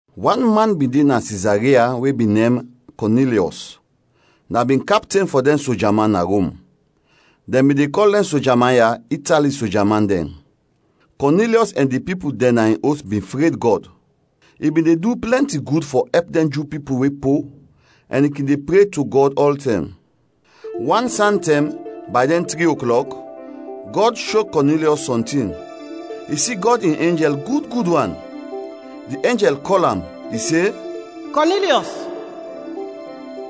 Wan man bin de na Sizaria we bin nem Kɔnilyɔs, na bin kapten fɔ dɛn soja man na Rom. Dɛn bin de kɔl dɛn soja man ya “Itali Soja man Dɛn”. Kɔnilyɔs ɛn di pipul dɛn na in os bin fred Gɔd. I bin de du plɛnti gud fɔ ɛp dɛn Ju pipul we po ɛn i kin de pre to Gɔd ɔltɛm. Wan santɛm, bay dɛn tri oklɔk, Gɔd sho Kɔnilyɔs sɔntin. I si Gɔd in enjɛl gud gud wan; di enjɛl kɔl am, i se, “Kɔnilyɔs!”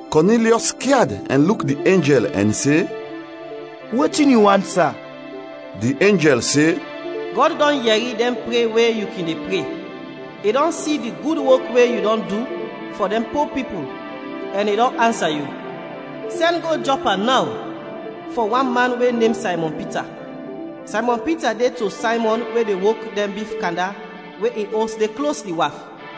Kɔnilyɔs skyad ɛn luk di enjɛl ɛn se, “Wetin yu want, sa?” Di enjɛl se, “Gɔd dɔn yɛri dɛn pre we yu kin de pre, i dɔn si di gud wok we yu dɔn du fɔ dɛn po pipul, ɛn i dɔn ansa yu. Sɛn go Jɔpa naw fɔ wan man we nem Saymɔn Pita. Saymɔn Pita de to Saymɔn we de wok dɛn bif kanda we in os de klos di waf.”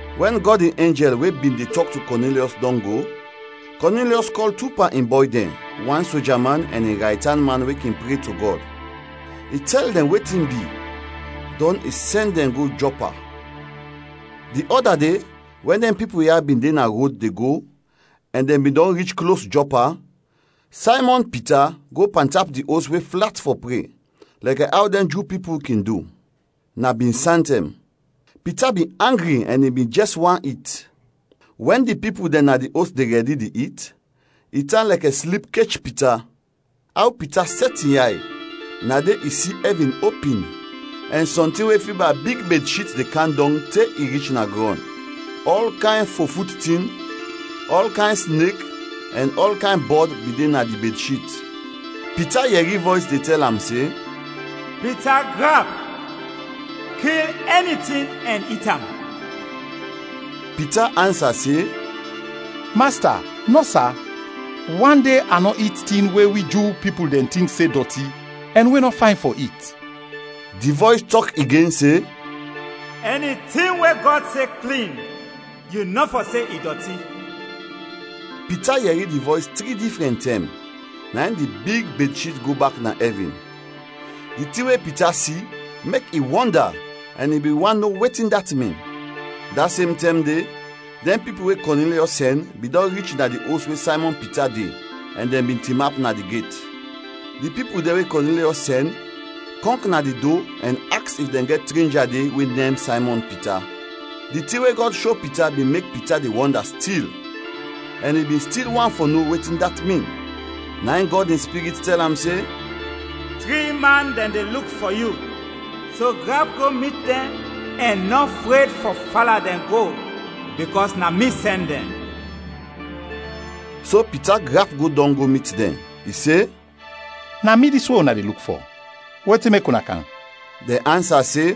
Wɛn Gɔd in enjɛl we bin de tɔk to Kɔnilyɔs dɔn go, Kɔnilyɔs kɔl tu pan in bɔy dɛn, wan soja man, ɛn in raytan man we kin pre to Gɔd. I tɛl dɛn wetin bi, dɔn i sɛn dɛn go Jɔpa. Di ɔda de wɛn dɛn pipul ya bin de na rod de go ɛn dɛn bin dɔn rich klos Jɔpa, Saymɔn Pita go pantap di os we flat fɔ pre lɛkɛ aw dɛn Ju pipul kin du. Na bin santɛm. Pita bin angri ɛn i bin jɛs want it. Wɛn di pipul dɛn na di os de rɛdi di it, i tan lɛkɛ slip kech Pita. Aw Pita sɛt in yay, na de i si ɛvin opin ɛn sɔntin we fiba big bedshit de kam dɔng te i rich na grɔn. Ɔl kayn fofut tin, ɔl kayn snek ɛn ɔl kayn bɔd bin de na di bedshit. Pita yɛri vɔys de tɛl am se, “Pita, grap; kil ɛni tin ɛn it am!” Pita ansa se, “Masta, nɔ, sa; wan de a nɔ it tin we wi Ju pipul dɛn tink se dɔti ɛn we nɔ fayn fɔ it.” Di vɔys tɔk igen se, “Ɛni tin we Gɔd se klin, yu nɔ fɔ se i dɔti.” Pita yɛri di vɔys tri difrɛn tɛm, na in di big bedshit go bak na ɛvin. Di tin we Pita si mek i wɔnda ɛn i bin want no wetin dat min. Da sem tɛm de, dɛn pipul we Kɔnilyɔs sɛn bin dɔn rich na di os we Saymɔn Pita de ɛn dɛn bin tinap na di get. Di pipul dɛn we Kɔnilyɔs sɛn, kɔnk na di do ɛn aks if dɛn gɛt trenja de we nem Saymɔn Pita. Di tin we Gɔd sho Pita bin mek Pita de wɔnda stil ɛn i bin stil want fɔ no wetin dat min, na in Gɔd in Spirit tɛl am se, “Tri man dɛn de luk fɔ yu. So grap go mit dɛn ɛn nɔ fred fɔ fala dɛn go bikɔs na mi sɛn dɛn.” So Pita grap go dɔng go mit dɛn. I se, “Na mi dis we una de luk fɔ, wetin mek una kam?” Dɛn ansa se,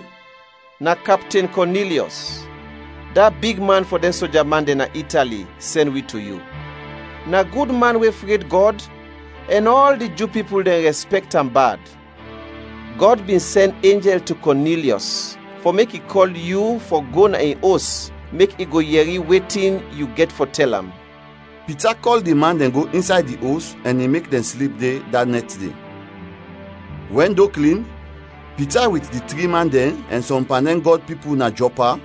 “Na Kapten Kɔnilyɔs, da bigman fɔ dɛn soja man dɛn na Itali, sɛn wi to yu. Na gud man we fred Gɔd ɛn ɔl di Ju pipul dɛn rɛspɛkt am bad. Gɔd bin sɛn enjɛl to Kɔnilyɔs fɔ mek i kɔl yu fɔ go na in os, mek i go yɛri wetin yu gɛt fɔ tɛl am.” Pita kɔl di man dɛn go insay di os ɛn i mek dɛn slip de, da nɛt de. Wɛn do klin, Pita wit di tri man dɛn, ɛn sɔm pan dɛn Gɔd pipul na Jɔpa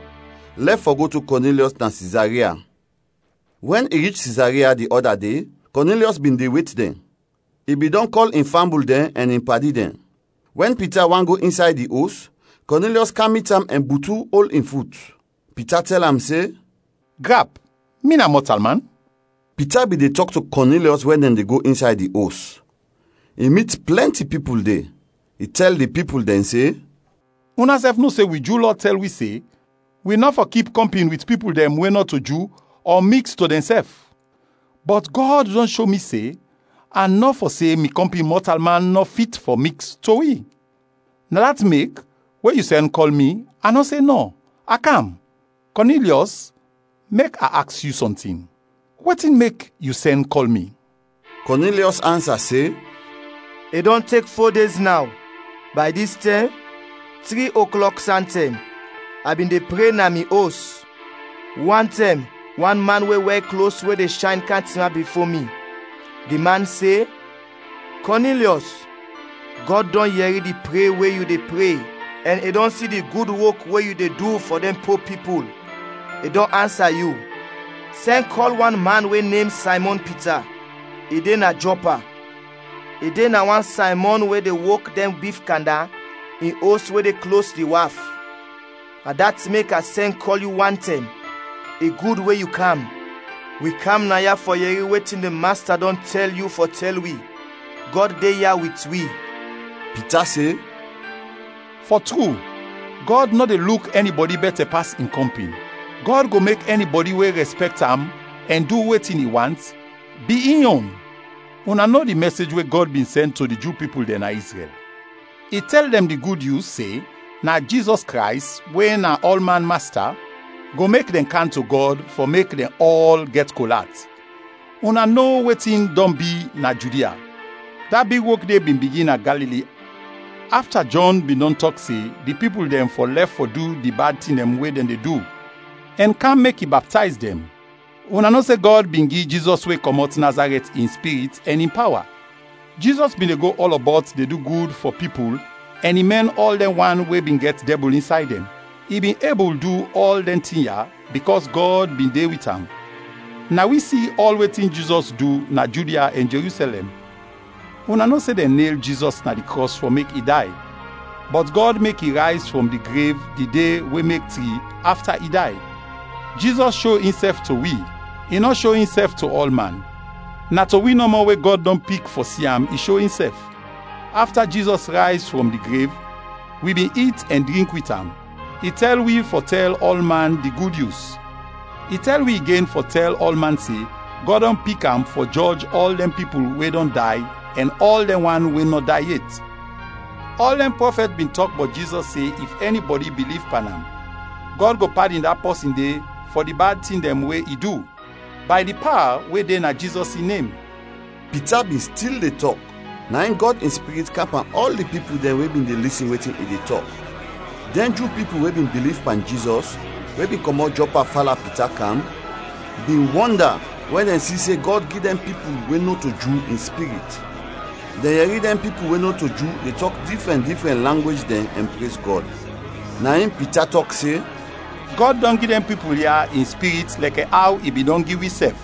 lɛf fɔ go to Kɔnilyɔs na Sizaria. Wɛn i rich Sizaria di ɔda de, Kɔnilyɔs bin de wet dɛn, i bin dɔn kɔl in fambul dɛn ɛn in padi dɛn. Wɛn Pita want go insay di os, Kɔnilyɔs kam mit am ɛn butu ol in fut. Pita tɛl am se, “Grap, mi na mɔtalman.” Pita bin de tɔk to Kɔnilyɔs wɛn dɛn de go insay di os. I mit plɛnti pipul de. I tɛl di pipul dɛn se, “Unasɛf no se wi Ju Lɔ tɛl wi se wi nɔ fɔ kip kɔmpin wit pipul dɛn we nɔto Ju ɔ miks to dɛn sɛf. Bɔt Gɔd dɔn sho mi se a nɔ fɔ se mi kɔmpin mɔtalman nɔ fit fɔ miks to wi. Na dat mek, we yu sɛn kɔl mi a nɔ se nɔ; a kam. Kɔnilyɔs, mek a aks yu sɔntin, wetin mek yu sɛn kɔl mi?” Kɔnilyɔs ansa se, “I dɔn tek fo dez naw, bay dis tɛm, tri oklok santɛm, a bin de pre na mi os. Wantɛm, wan man we wɛr klos we de shayn kam tinap bifo mi. Di man se, ‘Kɔnilyɔs, Gɔd dɔn yɛri di pre we yu de pre ɛn i dɔn si du gud wok we yu dɔn du fɔ dɛn po pipul. I dɔn ansa yu. Sɛn kɔl wan man we nem Saymɔn Pita, i de na Jɔpa; i de na wan Saymɔn we de wok dɛn bif kanda, in os we de klos di waf.’ Na dat mek a sɛn kɔl yu wantɛm. I gud we yu kam. Wi kam naya fɔ yɛri wetin di Masta dɔn tɛl yu fɔ tɛl wi. Gɔd de ya wit wi.” Pita se, “Fɔ tru, Gɔd nɔ de luk ɛnibɔdi bɛtɛ pas in kɔmpin. Gɔd go mek ɛnibɔdi we rɛspɛkt am ɛn du wetin i want, bi in yon. Una no di mɛsej we Gɔd bin sɛn to di Ju pipul dɛn na Izrɛl, i tɛl dɛn di Gud Nyus se na Jizɔs Krays we na ɔlman Masta, go mek dɛn kam to Gɔd fɔ mek dɛn ɔl gɛt kol at. Una no wetin dɔn bi na Judia. Da big wok de bin bigin na Galili afta Jɔn bin dɔn tɔk se di pipul dɛn fɔ lɛf fɔ du di bad tin dɛn we dɛn de du ɛn kam mek i baptayz dɛn. Una no se Gɔd bin gi Jizɔs we kɔmɔt Nazarɛt in Spirit ɛn in pawa. Jizɔs bin de go ɔlɔbɔt de du gud fɔ pipul ɛn i mɛn ɔl dɛn wan we bin gɛt dɛbul insay dɛn. I bin ebul du ɔl dɛn tin ya bikɔs Gɔd bin de wit am. Na wi si ɔl wetin Jizɔs du na Judia ɛn Jerusɛlɛm. Una no se dɛn nel Jizɔs na di krɔs fɔ mek i day. Bɔt Gɔd mek i rayz frɔm di grev di de we mek tri, afta i day. Jizɔs sho insɛf to wi. I nɔ sho insɛf to ɔlman! Na to wi nɔmɔ, we Gɔd dɔn pik fɔ si am, i sho insɛf. Afta Jizɔs rayz frɔm di grev, wi bin it ɛn drink wit am. I tɛl wi fɔ tɛl ɔlman di Gud Nyus. I tɛl wi igen fɔ tɛl ɔlman se Gɔd dɔn pik am fɔ jɔj ɔl dɛn pipul we dɔn day ɛn ɔl dɛn wan we nɔ day yet. Ɔl dɛn prɔfɛt bin tɔk bɔt Jizɔs se if ɛnibɔdi biliv pan am, Gɔd go padin da pɔsin de fɔ di bad tin dɛn we i du, bay di pawa we de na Jizɔs in nem.” Pita bin stil de tɔk, na in Gɔd in Spirit kam pan ɔl di pipul dɛn we bin de lisin wetin i de tɔk. Dɛn Ju pipul we bin biliv pan Jizɔs we bin kɔmɔt Jɔpa fala Pita kam, bin wɔnda wɛn dɛn si se Gɔd gi dɛn pipul we nɔto Ju, in Spirit. Dɛn yɛri dɛn pipul we nɔto Ju de tɔk difrɛn difrɛn langwej dɛn ɛn prez Gɔd. Na in Pita tɔk se, “Gɔd dɔn gi dɛn pipul ya in Spirit lɛkɛ aw i bin dɔn gi wisɛf.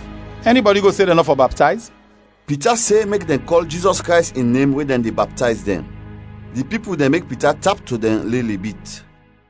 Ɛnibɔdi go se dɛn nɔ fɔ baptayz?” Pita se mek dɛn kɔl Jizɔs Krays in nem we dɛn de baptayz dɛn. Di pipul dɛn mek Pita tap to dɛn lili bit.